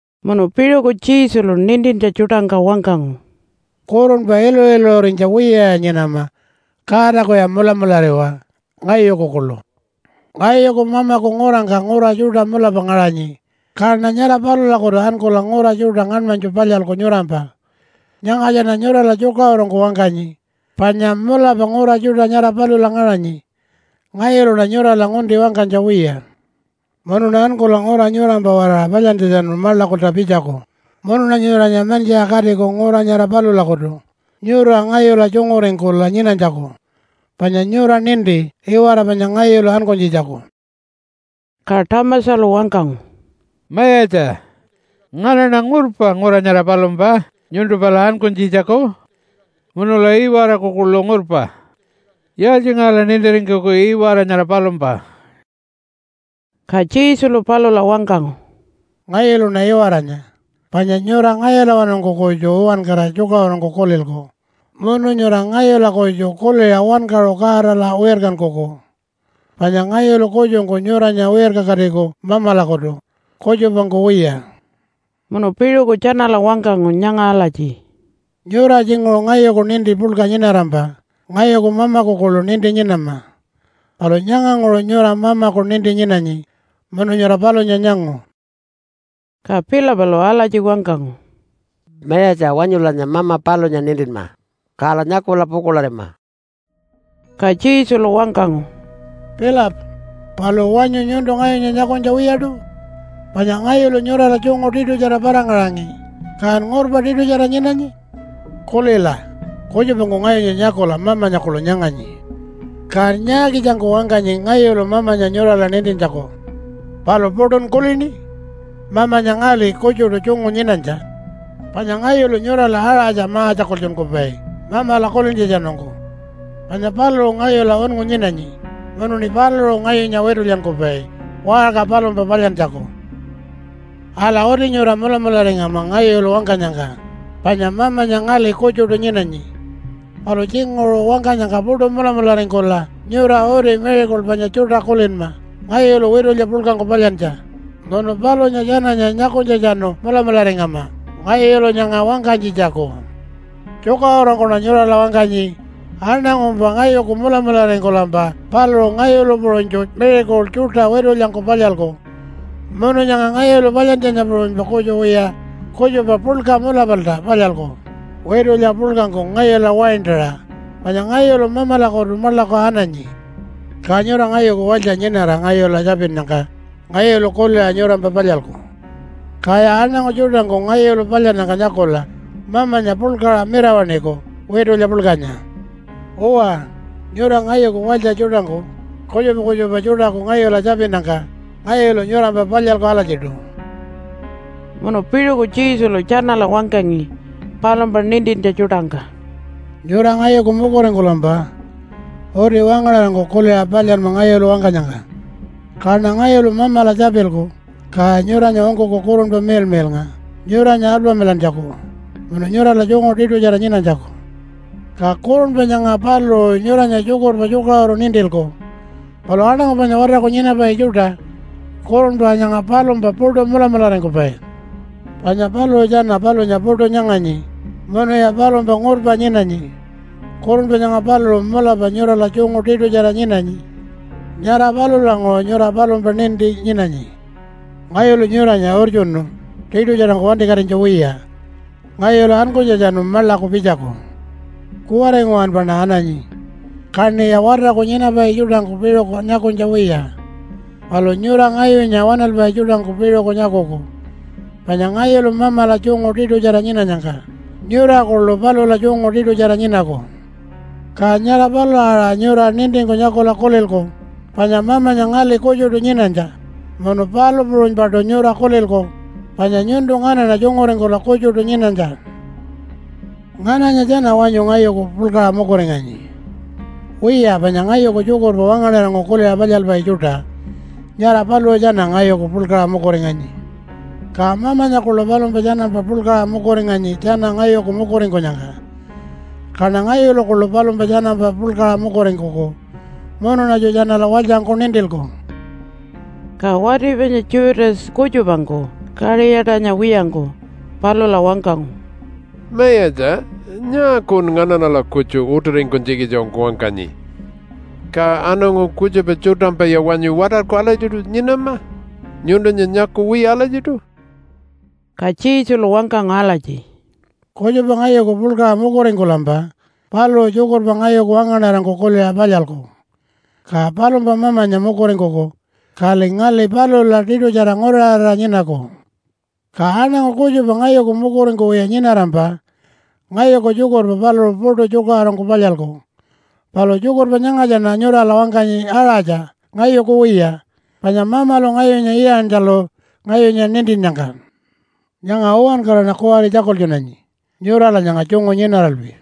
Munu piṟuku Jesulu nintintja tjuṯangka wangkangu, “Kurunpa iluṟu-iluṟurinytja wiyaya nyinama. Godakuya mulamulariwa, ngayuku kuḻu. Ngayuku Mamaku ngurangka ngura tjuṯa mulapa ngaṟanyi, kaṉa nyara palulakutu ankula ngura tjuṯa ngaṉmanytju palyalku nyurampa. Nyangatjaṉa nyurala tjukaṟurungku wangkanyi, panya mulapa ngura tjuṯa nyara palula ngaṟanyi. Ngayuluṉa nyurala ngunti wangkanytja wiya. Munuṉa ankula ngura nyurampa-waraṟa palyantjatjanu maḻakulta pitjaku, munuṉa nyuranya mantjiṟa katiku ngura nyara palulakutu nyura ngayula tjunguringkula nyinanytjaku. Panya nyura ninti iwara panya ngayulu ankunytjitjaku.” Ka Thomasalu wangkangu, “Mayatja, nganaṉa ngurpa ngura nyara palumpa nyuntu pala ankunytjitjaku. Munula iwaraku kuḻu ngurpa. Yaaltjingaṟala nintiringkuku iwara nyara palumpa?” Ka Jesulu palula wangkangu, “Ngayuluṉa iwaranya, panya nyura ngayulawanungku kutju uwankara tjukaṟurungku kulilku munu nyura ngayula kutju kuliṟa wankaṟu Godala wirkankuku. Panya ngayulu kutjungku nyuranya wirkakatiku Mamalakutu, kutjupangku wiya.” Munu piṟuku tjanala wangkangu nyanga alatji, “Nyura tjinguṟu ngayuku ninti puḻka nyinarampa ngayuku Mamaku kuḻu ninti nyinama. Palu nyanganguṟu nyura Mamaku ninti nyinanyi, munu nyura palunya nyangu.” Ka Philipalu alatji wangkangu, “Mayatja, wanyulanya Mama palunya nintinma, kala nyakula pukuḻarima.” Ka Jesulu wangkangu, “Philip, palu wanyu nyuntu ngayunya nyakunytja wiyaṯu? Panya ngayulu nyurala tjungu tiṯutjara para-ngaṟangi, kan ngurpa tiṯutjara nyinanyi? Kulila, kutjupangku ngayunya nyakula Mamanya kuḻu nyanganyi. Kan nyaakitjangku wangkanyi ngayulu Mamanya nyurala nintintjaku? Palu puṯun kulini? Mamanya ngali kutjuṯu tjungu nyinanytja. Panya ngayulu nyurala aṟatja ma-tjakultjunkupai Mamala kulintjatjanungku. Panya paluṟu ngayula unngu nyinanyi munuṉi paluṟu ngayunya witulyankupai waṟka palumpa palyantjaku. “Ala, uti nyura mulamularingama ngayulu wangkanyangka, panya Mamanya ngali kutjuṯu nyinanyi. Palu tjinguṟu wangkanyangka puṯu mulamularingkula nyura uti miracle panya tjuṯa kulinma ngayulu witulya puḻkangku palyantja, munu palunya tjananya nyakunytjatjanu mulamularingama ngayulu nyanga wangkanytjitjaku. Tjukaṟurungkuṉa nyurala wangkanyi, aṉangumpa ngayuku mulamularingkulampa paluṟu ngayulu puṟunytju miracle tjuṯa witulyangku palyalku. Munu nyanga ngayulu palyantjanya puṟunypa kutju wiya kutjupa puḻka mulapalta palyalku witulya puḻkangku ngayula waintaṟa, panya ngayulu Mamalakutu maḻaku ananyi. Ka nyura ngayuku walytja nyinara ngayula tjapinnyangka ngayulu kuliṟa nyurampa palyalku. Kaya aṉangu tjuṯangku ngayulu palyannyangka nyakula Mamanya puḻkaṟa mirawaṉiku witulya puḻkanya. Uwa, nyura ngayuku walytja tjuṯangku kutjupa kutjupa tjuṯaku ngayula tjapinnyangka ngayulu nyurampa palyalku alatjiṯu.” Munu piṟuku Jesulu tjanala wangkangi palumpa nintintja tjuṯangka, “Nyura ngayuku mukuringkulampa uti wangaṉarangku kuliṟa palyanma ngayulu wangkanyangka. Kaṉa ngayulu Mamala tjapilku, ka nyuranya ungkuku Kurunpa Miḻmiḻnga nyuranya alpamilantjaku munu nyurala tjungu tiṯutjara nyinanytjaku. Ka Kurunpa nyanga paluṟu nyuranya tjukurpa tjukaṟuru nintilku. Palu aṉangu panya watarku nyinapai tjuṯa Kurunpa nyanga palumpa puṯu mulamularingkupai. Panya paluṟu tjana palunya puṯu nyanganyi munuya palumpa ngurpa nyinanyi. Kurunpa nyanga paluṟu mulapa nyurala tjungu tiṯutjara nyinanyi. Nyara palulanguṟu nyura palumpa ninti nyinanyi. Ngayulu nyuranya urtjunu tiṯutjarangku wantikatinytja wiya. Ngayulu ankunytjatjanu maḻaku pitjaku. Kuwari nguwanpaṉa ananyi. Kaṉiya watarku nyinapai tjuṯangku piṟuku nyakunytja wiya. Palu nyura ngayunya waṉalpai tjuṯangku piṟuku nyakuku. Panya ngayulu Mamala tjungu tiṯutjara nyinanyangka nyura kuḻu palula tjungu tiṯutjara nyinaku. Ka nyara palula aṟa nyura nintingku nyakula kulilku panya Mamanya ngali kutjuṯu nyinanytja, munu palu puṟunypaṯu nyura kulilku panya nyuntu nganaṉa tjunguringkula kutjuṯu nyinanytja. “Ngananya tjana wanyu ngayuku puḻkaṟa mukuringanyi? Wiya panya ngayuku tjukurpa wangaṉarangku kuliṟa palyalpai tjuṯa, nyara paluṟu tjana ngayuku puḻkaṟa mukuringanyi. Ka Mamanya kuḻu palumpa tjanampa puḻkaṟa mukuringanyi tjana ngayuku mukuringkunyangka. Kaṉa ngayulu kuḻu palumpa tjanampa puḻkaṟa mukuringkuku munuṉatju tjanala walytjangku nintilku.” Ka wati panya Judas kutjupangku, Kaṟiyatanya wiyangku, palula wangkangu, “Mayatja, nyaakun nganaṉala kutju utiringkunytjikitjangku wangkanyi? Ka aṉangu kutjupa tjuṯampaya wanyu watarku alatjiṯu nyinama, nyuntunya nyakuwiya alatjiṯu?” Ka Jesulu wangkangu alatji, “Kutjupa ngayuku puḻkaṟa mukuringkulampa paluṟu tjukurpa ngayuku wangaṉarangku kuliṟa palyalku. Ka palumpa Mamanya mukuringkuku, kali ngali palula tiṯutjara nguraṟarira nyinaku. Ka aṉangu kutjupa ngayuku mukuringkuwiya nyinarampa ngayuku tjukurpa paluṟu puṯu tjukaṟurungku palyalku. Palu tjukurpa nyangatjaṉa nyurala wangkanyi aṟatja ngayuku wiya, panya Mamalu ngayunya iyantjalu ngayunya nintinnyangka. Nyanga uwankaraṉa kuwari tjakultjunanyi nyurala nyanga tjungu nyinaralpi.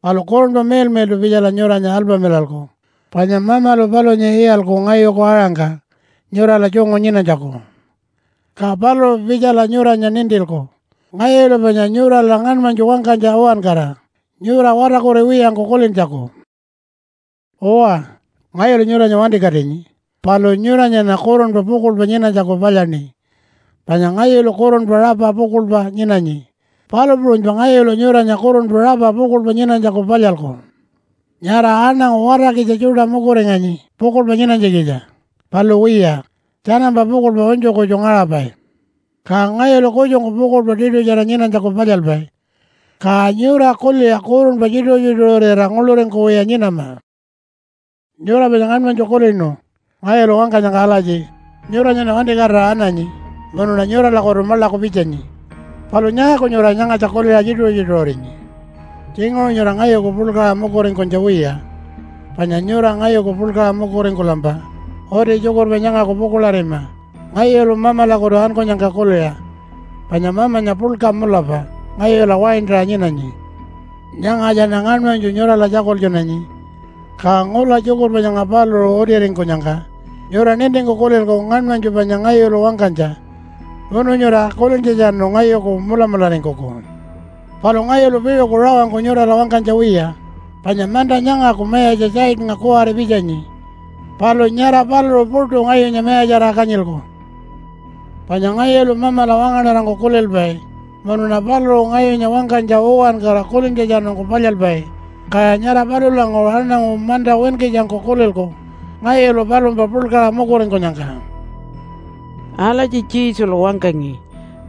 Palu Kurunpa Miḻmiḻṯu pitjala nyuranya alpamilalku, panya Mamalu palunya iyalku ngayuku aṟangka nyurala tjungu nyinanytjaku. Ka paluṟu pitjala nyuranya nintilku ngayulu panya nyurala ngaṉmanytju wangkanytja uwankara nyura watarkuriwiyangku kulintjaku. “Uwa, ngayulu nyuranya wantikatinyi palu nyuranyaṉa kurunpa pukuḻpa nyinanytjaku palyaṉi. Panya ngayulu kurunpa rapa pukuḻpa nyinanyi, palu puṟunypa ngayulu nyuranya kurunpa rapa pukuḻpa nyinanytjaku palyalku. Nyara aṉangu watarkitja tjuṯa mukuringanyi pukuḻpa nyinanytjikitja. Palu wiya, tjanampa pukuḻpa unytju kutju ngaṟapai. Ka ngayulu kutjungku pukuḻpa tiṯutjara nyinanytjaku palyalpai. Ka nyura kuliṟa kurunpa tjituṟu-tjituṟurira nguḻuringkuwiya nyinama. “Nyura panya ngaṉmanytju kulinu ngayulu wangkanyangka alatji, ‘Nyuranyaṉa wantikatira ananyi, munuṉa nyuralakutu maḻaku pitjanyi.’ Palu nyaaku nyura nyangatja kuliṟa tjituṟu-tjituṟurinyi? Tjinguṟu nyura ngayuku puḻkaṟa mukuringkunytja wiya. Panya nyura ngayuku puḻkaṟa mukuringkulampa uti tjukurpa nyangaku pukuḻarima ngayulu Mamalakutu ankunyangka kuliṟa. Panya Mamanya puḻka mulapa ngayula waintaṟa nyinanyi. Nyangatjaṉa ngaṉmanytju nyurala tjakultjunanyi. Ka ngula tjukurpa nyanga paluṟu utiringkunyangka nyura nintingku kulilku ngaṉmanytju panya ngayulu wangkanytja. Munu nyura kulintjatjanu ngayuku mulamularingkuku. Palu ngayulu piṟuku rawangku nyurala wangkanytja wiya, panya manta nyangaku mayatja Satannga kuwari pitjanyi. Palu nyara paluṟu puṯu ngayunya mayatjarira kanyilku. “Panya ngayulu Mamala wangaṉarangku kulilpai munuṉa paluṟu ngayunya wangkanytja uwankara kulintjatjanungku palyalpai, kaya nyara palulanguṟu aṉangu manta winkitjangku kulilku ngayulu palumpa puḻkaṟa mukuringkunyangka.” Alatji Jesulu wangkangi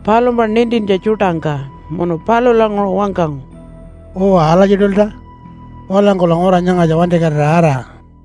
palumpa nintintja tjuṯangka munu palulanguṟu wangkangu, “Uwa alatjiṯulta. Walangkula ngura nyangatja wantikatira ara.”